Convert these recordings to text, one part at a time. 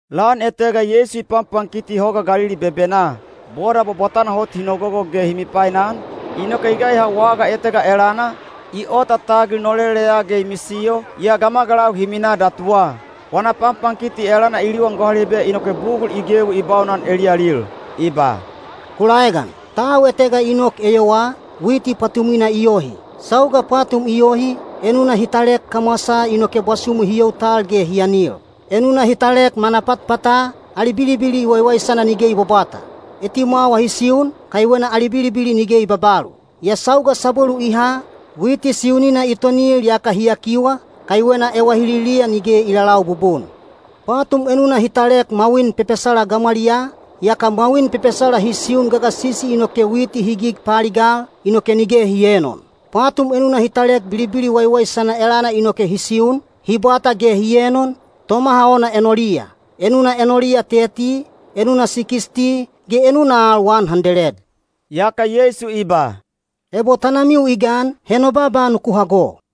Lan etega Yeisu i panpankiti Hoga Galili bebenaa. Boda bwabwatana hot hi nogogo ge hi mipainan, inoke i gaiha waga etega elana, i ota tagil noleleya ge i misiyo, yaa gamagalau hi minaa datuwa. Wana panpankiti elana i liwan gohalibe inoke bugul i gewi i baunan eliyalil. I ba, “Ku laegan! Tau etega i nok eyowaa, witi pwatumwina i yohi. Sauga pwatum i yohi, enuna hi talek kamwasaa inoke bwasumu hi you tal ge hi anil. Enuna hi talek manapatpata, ali bilibili waiwaisana nige i bwabwata. Etimwawa hi siun, kaiwena ali bilibili nige i babalu. Yaa sauga sabwelu i ha, witi siunina i tonil yaka hi yakiwa, kaiwena ewahililiya nige i lalau bubun. Pwatum enuna hi talek mwawin pepesala gamwaliyaa, yaka mwawin pepesala hi siun gagasisi inoke witi hi gig paaligal, inoke nige hi eenon. Pwatum enuna hi talek bilibili waiwaisana elana inoke hi siun, hi bwata ge hi enon, tomaha ona enoliya. Enuna enoliya teti, enuna sikisti, ge enuna al wan handeled.” Yaka Yeisu i ba, “Ebo tanamiu i gan, he no baaba nuku hago.”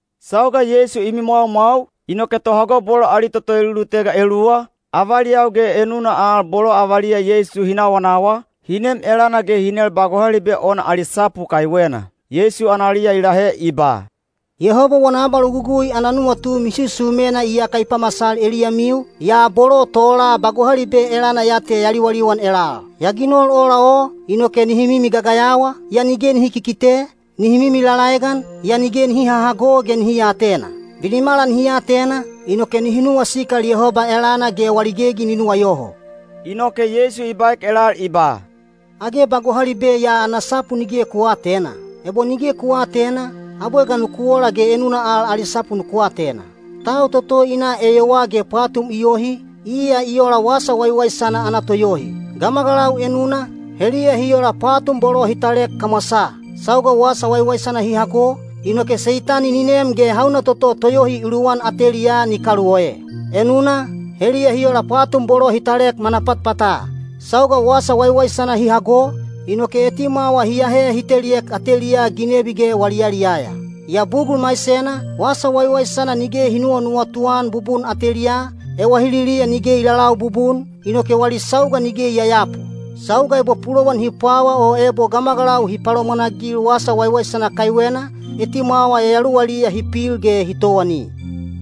Sauga Yeisu i mimwaumwau, inoke tohago bolo ali toto elulutega eluwa, avaliyau ge enuna al bolo avaliya Yeisu hi nawanawa, hi nem elana ge hi nel ba gohalibe ona ali sapu kaiwena. Yeisu analiya i lahe i ba, “Yehoba wana abalogugui ana nuwatu misusumena iyaka i pamasal eliyamiu, yaa bolo tola ba gohalibe elana ya te ya liwaliwan elal. Ya ginol ola o, inoke nihi mimi gagayawa, yaa nige nihi kikite, nihi mimi lalaegan, yaa nige nihi hahago ge nihi aatena. Binimala nihi atena, inoke nihi nuwasikal Yehoba elana ge wali gegi ni nuwayoho.” Inoke Yeisu i baek elal i ba, “Age ba gohalibe ya ana sapu nige ku aatena? Ebo nige ku aatena, abwe ga nuku ola ge enuna al ali sapu nuku atena? Tau toto i na eyowaa ge pwatum i yohi, iya i ola wasa waiwaisana ana toyohi. Gamagalau enuna, heliya hi ola pwatum bolo hi talek kamwasaa. Sauga wasa waiwaisana hi hago, inoke Seitani ni nem ge hauna toto toyohi i luwan ateliyaa ni kaluoe. Enuna, heliya hi ola pwatum bolo hi talek manapatpata. Sauga wasa waiwaisana hi hago, inoke etimwawa hi ahe hi teliek ateliyaa ginebi ge wali yaliyaya. Yaa bugul maisena, wasa waiwaisana nige hi nuwanuwatu-an bubun ateliyaa, ewahililiya nige i lalau bubun, inoke wali sauga nige i yayapu. Sauga ebo pulowan hi pwawa o ebo gamagalau hi palomwanagil wasa waiwaisana kaiwena, etimwawa yayaluwaliya hi pil ge hi towani.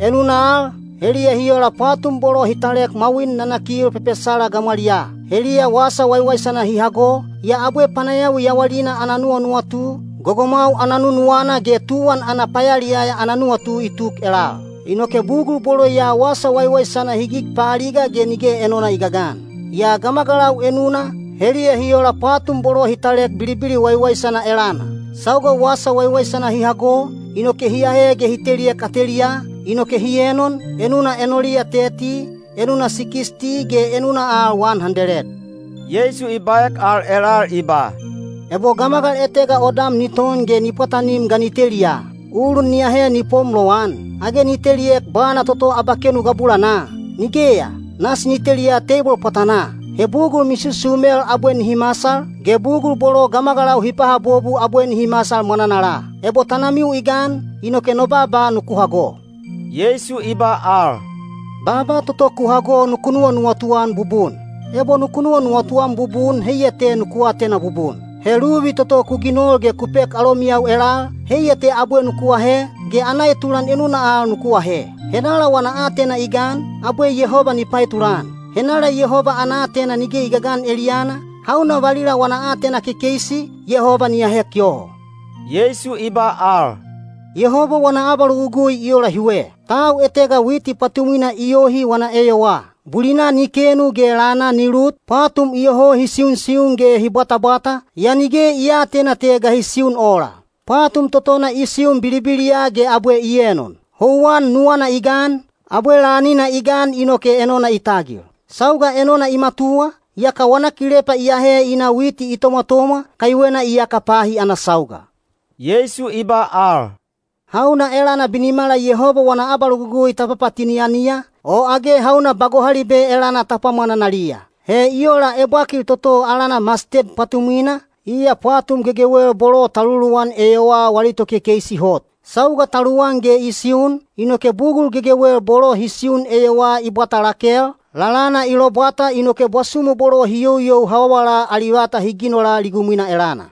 Enuna al, heliya hi ola pwatum bolo hi talek mwawin nanakil pepesala gamwaliyaa. Heliya wasa waiwaisana hi hago, yaa abwe panayawi yawalina ana nuwanuwatu, gogomwau ana nunuwana ge tuwan ana payaliyaya ana nuwatu i tuk elal. Inoke bugul bolo ya wasa waiwaisana hi gig paaliga ge nige enona i gagan. Yaa gamagalau enuna, heliya hi ola pwatum bolo hi talek bilibili waiwaisana elana. Sauga wasa waiwaisana hi hago, inoke hi ahe ge hi teliek ateliyaa, inoke hi enon, enuna enoliya teti, enuna sikisti ge enuna al wan handeled.” Yeisu i baek al elal i ba, “Ebo gamagal etega odam ni ton ge ni pwatanim ga ni teliya? Ulun ni ahe ni pom lowan? Age ni teliek bwana toto abakenu gabulanaa? Nigeya, nasi ni teliya teibol pwatanaa. He bugul misusumel abwe nihi masal, ge bugul bolo gamagalau hi pahabobu abwe nihi masal mwananala. Ebo tanamiu i gan, inoke no baaba nuku hago.” Yeisu i ba al, “Baaba toto ku hago nuku nuwanuwatu-an bubun. Ebo nuku nuwanuwatu-an bubun heiya te nuku atena bubun. He luvi toto ku ginol ge ku pek alomiyau elal, heiya te abwe nuku ahe, ge ana etulan enuna al nuku ahe. Henala wana aatena i gan, abwe Yehoba ni paetulan. Henala Yehoba ana aatena nige i gagan eliyana, hauna valila wana aatena kekeisi, Yehoba ni ahek yoho.” Yeisu i ba al, “Yehoba wana abalogugui i ola hiwe. Tau etega witi pwatumwina i yohi wana eyowaa. Bulina ni kenu ge lana ni lut, pwatum iyoho hi siusiun ge hi bwatabwata, yaa nige i aatena te ga hi siun ola. Pwatum totona i siun bilibiliya ge abwe i enon: houwan nuwana i gan, abwe lanina i gan inoke enona i tagil. Sauga enona i matuwa, yaka wana kilepa i ahe i na witi i tomwatomwa, kaiwena iyaka pahi ana sauga.” Yeisu i ba al, “Hauna elana binimala Yehoba wana abalogugui ta papatini-aniya, o age hauna ba gohalibe elana ta pwamwananaliya? He i ola ebwakil toto alana masted pwatumwina, iya pwatum gegewel bolo ta luluwan eyowaa wali tokekeisi hot. Sauga ta luwan ge i siun, inoke bugul gegewel bolo hi siun eyowaa i bwata lakel, lalana i lobwata inoke bwasumu bolo hi youyou hawawala ali vata hi ginola ligumwina elana.”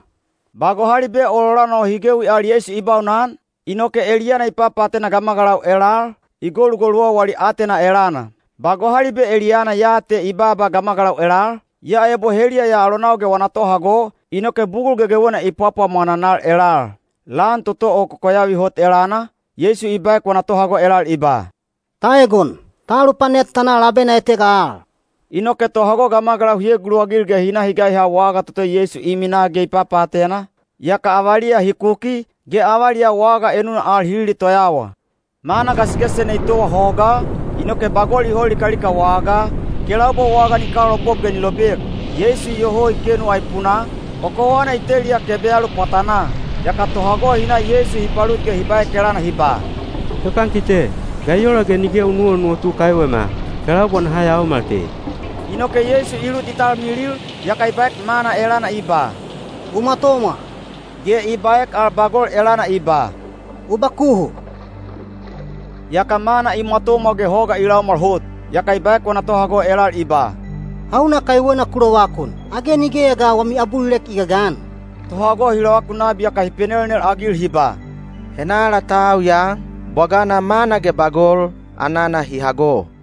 Ba gohalibe ololana o hi gewi al Yeisu i baunan, inoke eliyana i papaatena gamagalau elal, i golugoluwa wali aatena elana. Ba gohalibe eliyana ya te i baaba gamagalau elal, yaa ebo heliya ya alonau ge wana tohago, inoke bugul gegewena i pwapwamwananal elal. Lan toto o kokoyavi hot elana, Yeisu i baek wana tohago elal i ba, “Ta egon! Ta alupanet ta na labena etega al.” Inoke tohago gamagalau hi eguluwagil ge hi na hi gaiha waga toto Yeisu i minaa ge i papaatena, yaka avaliya hi kuki, ge avaliyau waga enuna al hi lilitoyawa. Mana gasigasisena i towa hogaa, inoke bagol i hol likalika wagaa, kelaubwa waga ni kalaopop ge ni lobek. Yeisu iyoho i kenu aipunaa, kokowana i teliya kebeyalu pwatanaa. Yaka tohago hi na Yeisu hi palut ge hi baek elana hi ba, “Topankite, ga i ola ge nige u nuwanuwatu kaiwema? Kelaubwa naha yaomal te.” Inoke Yeisu i lut i talmilil, yaka i baek mana elana i ba, “U mwatomwa,” ge i baek al bagol elana i ba, “U bakuhu.” Yaka mana i mwatomwa ge hoga i laumwal hot. Yaka i baek wana tohago elal i ba, “Hauna kaiwena ku lovakun? Age nigeya ga wami abulilek i gagan?” Tohago hi lovakun nabi yaka hi penelnel-agil hi ba, “Henala tau ya? Bwagana mana ge bagol, anana hi hago.”